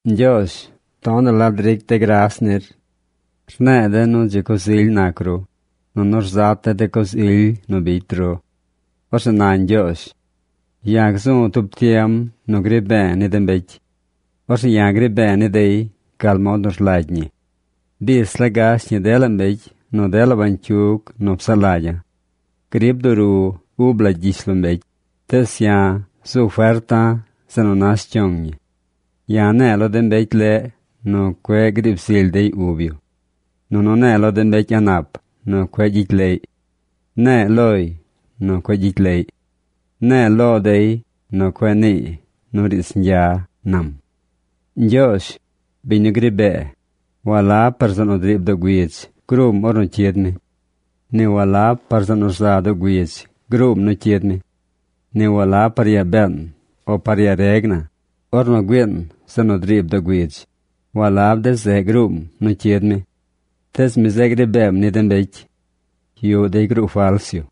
Ñgyoozh tonaꞌ la dric de̱ gras nir. Rne̱e̱ de̱ nu dzi coz ily nac ru, nunu rzat de̱ de coz ily nu bicy ru. Orzeꞌ na Ñgyoozh: “Ya̱ gzu̱ tub tiem nu gri be̱e̱ ni de mbecy. Orzeꞌ ya̱ gri be̱e̱ ni dey gal mod nu rlagy ñi. Bis la gash ñi dela mbecy nu dela bañcyug nu psaꞌ lagya̱. Grib duru ub la gyishlombecy, tees ya̱ zu ferta̱ zeꞌ nu nash cyong ñi. Ya̱ ne̱e̱ lo de mbecy leꞌ nu cueꞌ griib zily dey ub yu. Nunu ne̱e̱ lo de mbecy a̱ꞌ nap nu cueꞌ gyicy leꞌy. Ne̱e̱ loy nu cueꞌ gyicy leꞌy. Ne̱e̱ lo dey nu cueꞌ niiy nu riidz ñgya”, nam. Ñgyoozh, biñ nu gri bee, walab par zeꞌ nu driib doo güidz gruum ornu cyid mi. Ni walab par zeꞌ nu rza doo güidz gruum nu cyid mi. Ni walab par yaa been o par yaa reg na, ornu güiin zeꞌ nu driib doo güidz, walab de zeꞌ gruum nu cyid mi. Tees mi zeꞌ gri beem ni de mbecy. Yuꞌ dey gruu fals yu.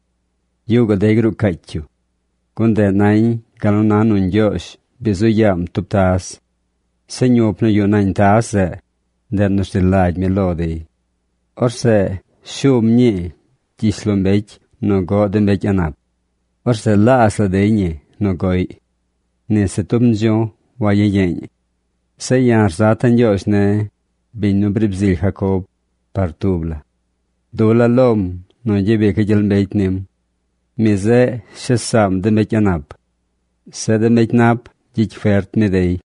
Yuꞌ gaꞌ dey gruu caacy yu. Gun ndeꞌ nañ gal nu na nu Ñgyoozh bi zu yaam tub taz. Zeꞌ ñup nu yuꞌ nañ taz zeꞌ, ndeꞌ nu rzi lagy mi lo dey. Orzeꞌ shum ñii gyishlombecy nu goꞌ de mbecy a̱ꞌ nap. Orzeꞌ laazh la dey ñi nu goꞌy. Ni se tub ndzu̱j wayiyeeñ. Zeꞌ ya̱ rzata̱ Ñgyoozh ne̱, biñ nu briib zily Jacob, par tub la. Dula̱ lom nu gyabica̱ gyel mbecy nim. Mi zeꞌ shes saam de mbecy a̱ꞌ nap. Zeꞌ de mbecy nap, gyicy fert mi dey.